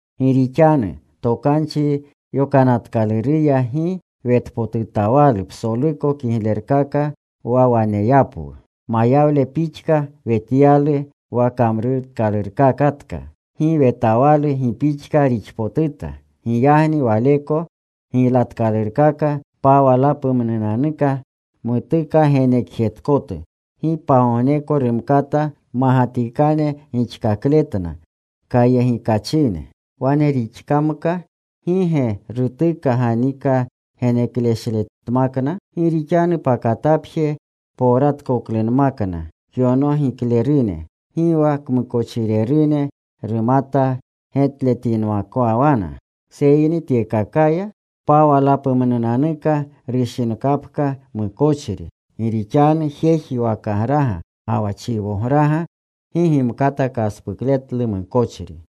Gi rixanu Tokanchi Yokanatkaluruya gi wetpotutawalu psoluko kiglerkaka wa waneyapwu. Mayawle pixka wetyalu wa kamrutkalurkakatka. Gi wetawalu gi pixka rixpotuta. Giyagni waleko giylatkalurkaka pawalapumnunanuka mutuka genekjetkotu, gi pagogneko rumkata mmagatikane gixkakletna kayegikachine. Wane rixkamka ¿gi ge rutuka ganika genekashletmakna? Gi rixanu pakatapje powratkoklunmakna kyonogiklerune, gi wa kmukochirerune rumata getletinmakwana. Seyni tyekakaya pawalapumnunanuka rushinkapka mukochri. Gi rixanu jeji wakagraga ga wa chiwograga gi gimkata kaspukletlu mukochri.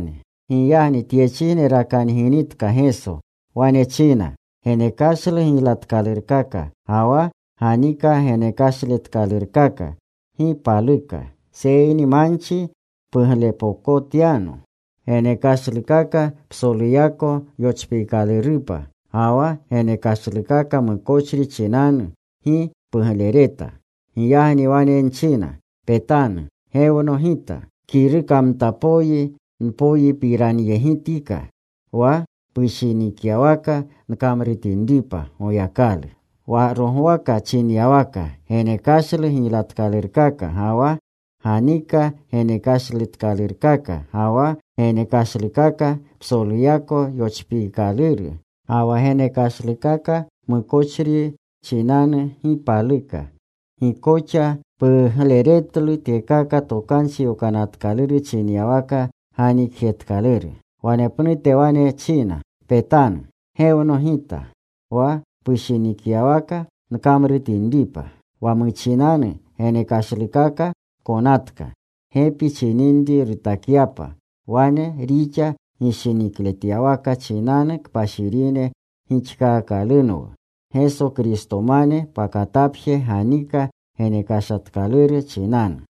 Giyagni tyechijne rakanginitka Geso, wane china: Genekashlu giylatkalurkaka ga wa ganika genekashletkalurkaka gi paluka. Seyni manchi puglepokotyano. Genekashlukaka psoluyako yochpiikalurupa ga wa genekashlukaka mukochri chinanu, gi puglereta. Giyagni wane nchina, “Petanu. Gewno Gita. Kirukamtapoyi nyonpiranyegitika, Wa pushinikyawaka nkamrutinripa, Goyakalu.” Wa rogwaka chinyawaka, “Genekashlu giylatkalurkaka ga wa ganika genekashletkalurkaka, ga wa genekashlukaka psoluyako yochpiikaluru, ga wa genekashlukaka mukochri chinanu, gi paluka. Gi koxa pugleretlu. Tyekaka Tokanchi Yokanatkaluru chinyawaka ganikjetkaluru.” Wanepnute wane china, “Petanu. Gewno Gita, wa pushinikyawaka nkamrutinripa.” Wa muchinanu genekashlukaka konatka, gepi chininri rutakyapa. Wane rixa gishinikletyawaka chinanu kpashirine gixkaakalunwu, Geso Kristomane pakatapje ganika genekashletkaluru chinanu.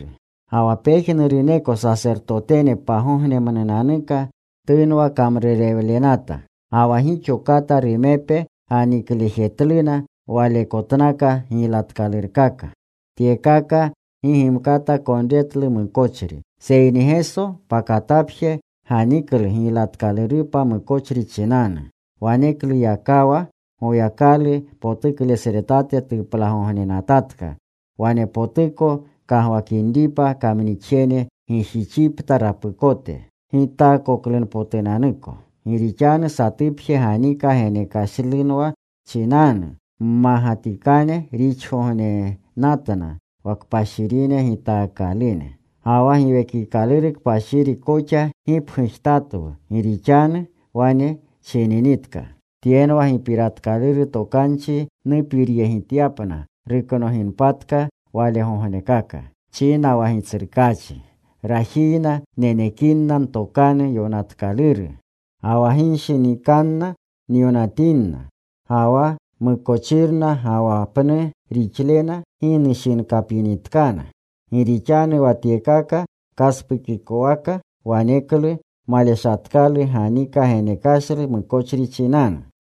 Ga wa pejnuruneko sasertotene pagognemnunanuka tunwa kamrurewlenata. Ga wa gixo kata rumepe ganiklejetluna walekotnaka giylatkalurkaka. Tyekaka gi gimkata konretlu mukochri. Seyni Geso pakatapje ganiklu giylatkalurupa mukochri chinanu. Wanekluyakawa Goyakalu potuklesretate tuplagognenatatka, wanepnute kagwakinripa kamnixjene gijixipta rapukote gitaakoklunpotunanuko. Gi rixanu satupje ganika genekashlewlu chinanu mmagatikane rixkakgognenatna wa kpashirine gitaakalune. Ga wa Giwekikaluru Kpashiri koxa gipgujtatwu. Gi rixanu wane chininitka: “Tyenwa gipiratkaluru tokanchi nupiryegityapna ruknoginpatka walegognekaka,” china wa Gitsrukaachi: “Rajiyna nenekinna Ntokanu Yokanatkaluru. Ga wa ginshinikanna nyonatinna. Ga wa mukochirna ga wa pnu rixlena gi nushinkapinitkana.” Gi rixanu wa tyekaka kaspukikowaka, waneklu maleshatkalu ganika genekashlu mukochri chinanu.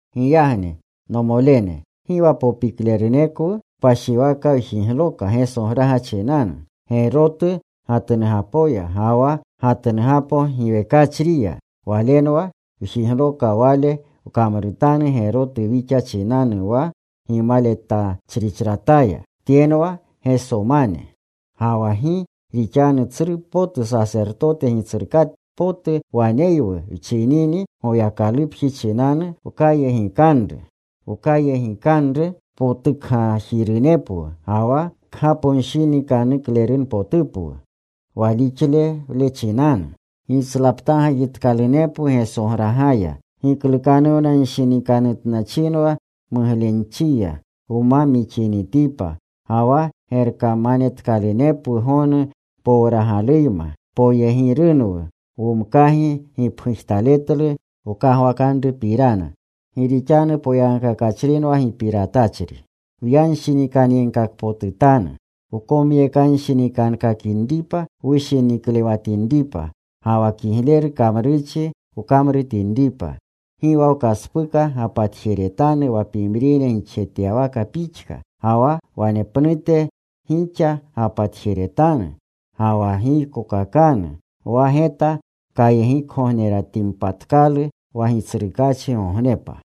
Giyagni, nomolene, gi wa popiklerunekwu kpashiwaka wjigloka Gesograga chinanu, gerotu gatnugapoya ga wa gatnugapo giwekachriya. Walenwa wjigloka Wale kamrutanru gerotu wixa chinanu wa gimaletachrichrataya. Tyenwa Gesomane. Ga wa gi rixanu tsru potu sasertote Gitsrukatpotu waneywu wchinini Goyakalupji chinanu, wkayegikanru. Wkayegikanru potukgajirunepwu ga wa kgaponshinikanuklerunpotupwu walixlewle chinanu. Gitslaptaagajitkalunepwu Gesogragaya giklukanuwnanshinikanutnachinwa muglenchiya wma mixinitipa. Ga wa gerkamanetkalunepwu gonu powragaluyma. Poyegirunwu womkagi gipgujtaletlu wkagwakanrupirana. Gi rixanu poyagkakachrinwa gipiratachri. Wyanshinikanyegkakpotutanu, wkomyekanshinikankakinripa wushiniklewatinripa ga wa kigleru kamrurchi wkamrutinripa. Gi wa wkaspuka gapatjeretanu wa pimrine gixjetyawaka pixka. Ga wa wanepnute gixa gapatjeretanu ga wa giykokakanu wa geta kayegikgogneretinpatkalu, wa Gitsrukachigognepa.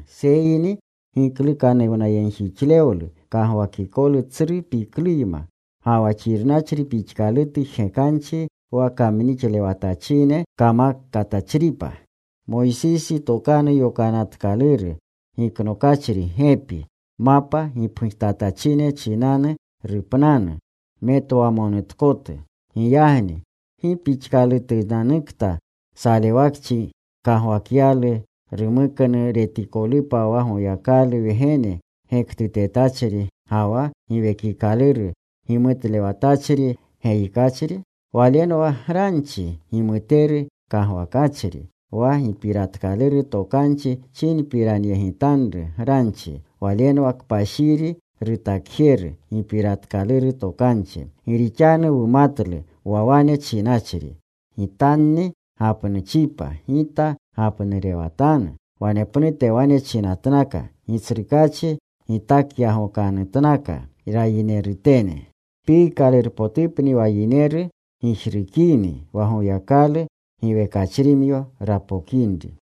seyni giklukanuwnayegjixlewlu kagwakikolu tsru pikluyma, ga wa xirnachri pixkalutu jgekanchi wa kamnixlewatachine kamakatachripa. Moysisi tokanu yokanatkaluru giknokachri gepi, mapa gipgujtatachine chinanu rupnanu metwamonutkotu. Giyagni ¿gi pixkalutunanukta salewakchi gkagwakyalu rumuknu retikolupa wa Goyakalu Wgene gektutetachri, ga wa Giwekikaluru gimutlewatachri geyikachri? Walenwa granchi gimuteru kagwakachri, wa gipiratkaluru tokanchi chinpiranyegitanru granchi. Walenwa kpashiri rutakjeru gipiratkaluru tokanchi. Gi rixanu wumatlu wa wane chinachri: “Gitanni gapnuuchipa. Gita gapnurewatanu.” Wanepnute wanechinatnaka: “Gitsrukaachi gitakyagokanutkana rayinerutene.” Piikalurpotupni wa yineru gijrukini, wa Goyakalu giwekachrimyo rapokinri.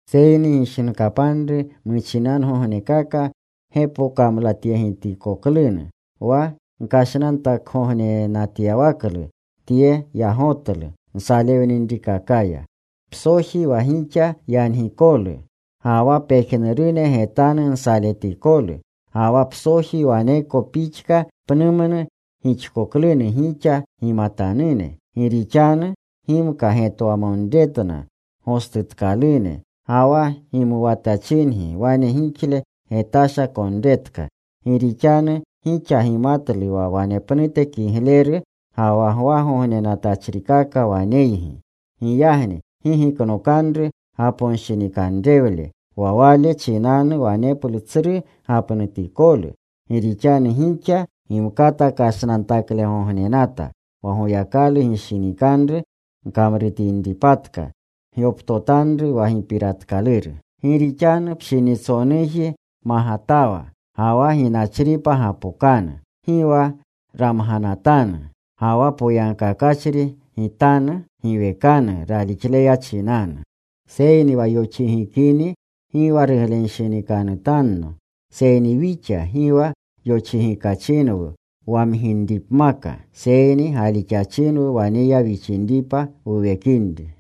Seyni gishinkapanru muchinanugognekaka, gepokamlatyegitkoklunu, wa gkashnantakgognenatyawaklu tsru yagotlu nsalewninrikakaya. Psoji wa gixa yangikolu ga wa pejnurune getanu nsaletikolu. Ga wa psoji waneko pixka pnumnu gixkoklunu gixa gimatanune. Gi rixanu gimata getwamonretna gostutkalune. Ga wa gimuwatachingi wane gixle getasha konretka. Gi rixanu gixa gimatlu wa wanepnute kigleru ga wa gwagognenatachrikaka waneygi. Giyagni gi giknokanru gaponshinikanrewle wa wale chinanu waneplu tsru gapnutikolu. Gi rixanu gixa gimkata kashnantaklegognenata. Wa Goyakalu gishinikanru gkamrutinpatka, gyoptotanru wa gipiratkaluru. Gi rixanu pshinitsonuuji magatawa Ga wa ginachripa gapokanu. Gi wa ramganatanu. Ga wa poyagkakachri Gitanu giwekanu ralixleya chinanu. Seyni wa yoxigikini gi wa ruglenshinikanutanno. Seyni wixa gi wa yoxigikachinwu wamginripmaka, seyni galixachinwu waneya wixinripa wuwekinri.